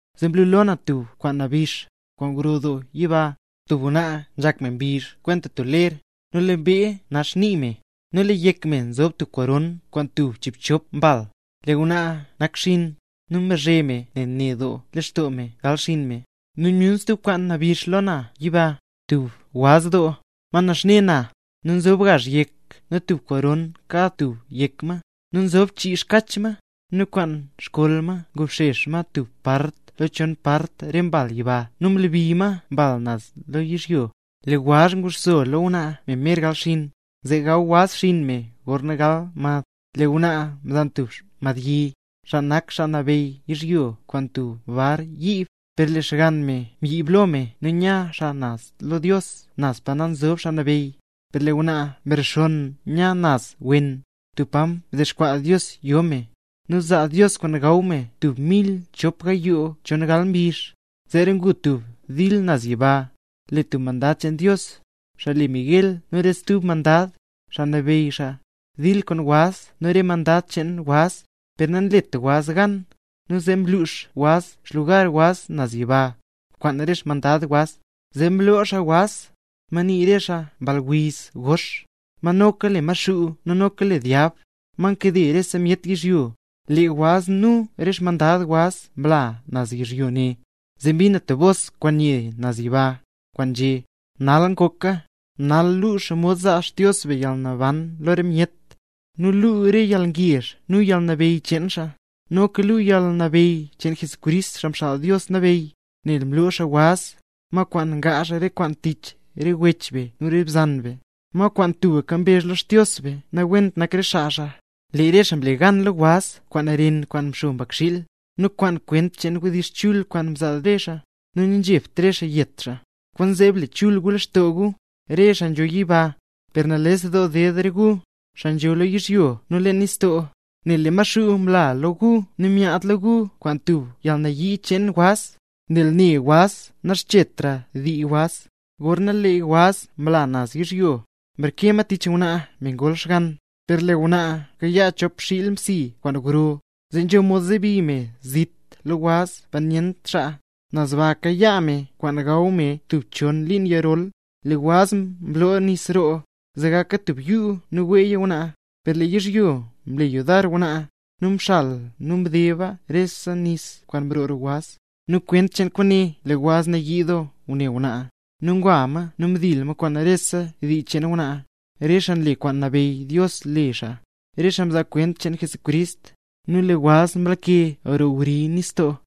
Zee mlu lo na tub kwaan nabix, kwaan gro doo yiba, tub ngwnaa nzhak me mbizh kwenta tub ler, nu lee mbee nax nii me, nu lee yek me nzob tub koron kwaan tub chiibchop mbal. Lee ngwnaa nakxiin, nu mbazhe me ne doo lextoo me gal xinn me. Zee myun stub kwaan nabix lo na yiba, tub waz doo, ma naxne na, nu nzob gazh yek nu tubga koron kad tub yek ma, nu nzob ma chii xkach ma. Nu kwaan xkol ma mdobxex ma tub part lo chon part re mbal yiba nu mlebi ma mbal naz lo yizhyo. Lee waz nguxso lo ngwnaa me mer gal xinn, zee gaw waz xinn me gorna gal mad. Nu lee ngwnaa mzan tub madbyi, xaa nak xaa nabeyy yizhyo kwaan tub bar yiib. Per lee xgann me mbyiib lo me nu nya xaa naz lo Dios, naz pa nzob xaa nabeyy; nu lee ngwnaa mrexonn nya naz wen, tub pa mdexkwaa Dios yo me, nu zaa Dios kwaan gaw me tub mil chop gayoo chon gal mbizh. Zeera ngu tub dil naz yiba. Lee tub mandad cheen Dios, xaa le Miguel nu re stub mandad, xaa nabeyy xaa, mdil kwaan waz nu re mandad cheen waz, per namlet waz gan. Nu zee mlux waz xlugar waz naz yiba, kwaan re xmandad waz. Zee mloo xaa waz, ma nii xaa Mball Wiz Gox, ma noka le Maxuu nu noka le Dyab, ma nkade rese myet yizhyo. Lee waz nu re xmandad waz mla naz yizhyo ne. Zee mbin na tub bos kwaan nye naz yiba, kwaan nzhé: ¡Nal ngoka! Nal luu xomod zaa Xdios be yalnaban lo myet, nu luu re yalngezh nu yalnabeyy cheen xaa, noka luu yalnabeyy cheen Crist, Xaa Mxaal Dios Nabeyy; nel mloo xaa waz, ma kwaan ngaazh re kwaan tich re wech be nu re bzan be, ma kwaan tubka mbezh lo Xdios be, nawent nak re xaa xaa. Lee re xaa mle gan lo waz kwaan ren kwaan mxo Mbakxiil, nu kwaan kwent cheen wdizh chul kwaan nzaa re xaa; nu nanzhebt re xaa yet xaa. ¡Kwaanzee, ble chul gu lextoo gu, re xaa nzho yiba! ¡Per nales doo ded re gu, xaa nzho lo yizhyo nu leen nistoo, nel lee Maxuu mla lo gu nu myaad lo gu, kwaan dub yalnayii cheen waz, nel ne waz naxchetra dii waz! Gorna lee waz mla naz yizhyo, mreke ma tich ngwnaa, me ngol xgann. Per lee ngwnaa mkayaa chop xiil msi kwaan gro, zee nzho mod zebi me zit lo waz, pa nyent xaa. Naz baa kayaa me kwaan gaw me tub chon liin yirol. Lee waz mlo nis roo, zee gaka tub yuu nu weeya ngwnaa; per lee yizhyo mle yudar ngwnaa, nu mxala nu mdeba re nis kwaan mroo roo waz. Nu kwent cheen kwaane, lee waz nayii doo ngune ngwnaa, nu ngwa ma nu mdil ma kwaan rese dii cheen ngwnaa, re xaa nle kwaan mnabeyy Dios le xaa, re xaa nzaa kwent cheen Jesucrist. Nu lee waz mlake roo wri nistoo.